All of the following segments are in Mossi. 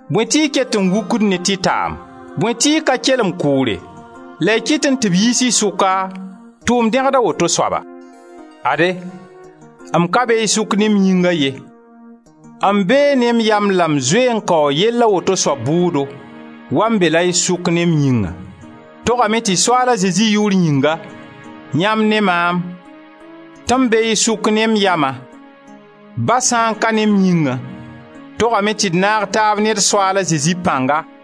Bõe tɩ y ket n wukd ne tɩtaam? Bõe tɩ y ka kelem kʋʋre la y kɩtẽ tɩ b yiis y sʋka, tʋʋm dẽgd a woto soaba? Ade, m ka be y sʋk ne m yĩnga ye; m bee ne m yam la m zoe n kaoo yell a woto soab bʋʋdo wa m beẽ la y sʋka ne m yĩngã. Togame tɩ Soaala Zezi yʋʋr yĩnga yãmb ne maam, tɩ m bee y sʋk ne m yama, ba sã n ka ne m yĩngã, togame tɩ d naag taab ne d Soaala Zezi pãnga,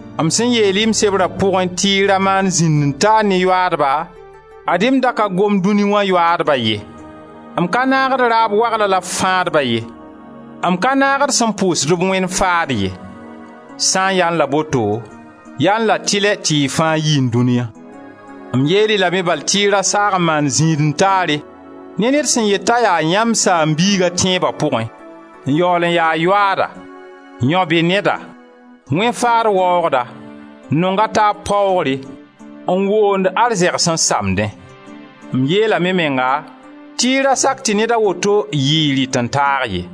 M sẽn yeel-y m sebra pʋgẽ tɩ y ra maan zĩnd-n-taar ne yoaadba, ad-y m da ka gomd dũni wã yoaadba ye, m ka naagd raab waglã la fãadba ye, m ka naagd sẽn pʋʋsdb wẽn-faad ye. Sã n yaẽ la boto, yaẽ la tɩlɛ tɩ y fãa yiẽ dũniya. M yeel-y lame bal tɩ y ra saag n maan zĩnd-n-taare ne ned sẽn yet t'a yaa yãmb saam-biiga a tẽeba pʋgẽ, n yaool n ya yoaada, yão-be-neda, wẽn-faad waoogda, n nong a taab paoogre, n woond arzɛgs n samdẽ. M yeelame menga tɩ y ra sak tɩ ned a woto yɩ y rɩt-n-taag ye.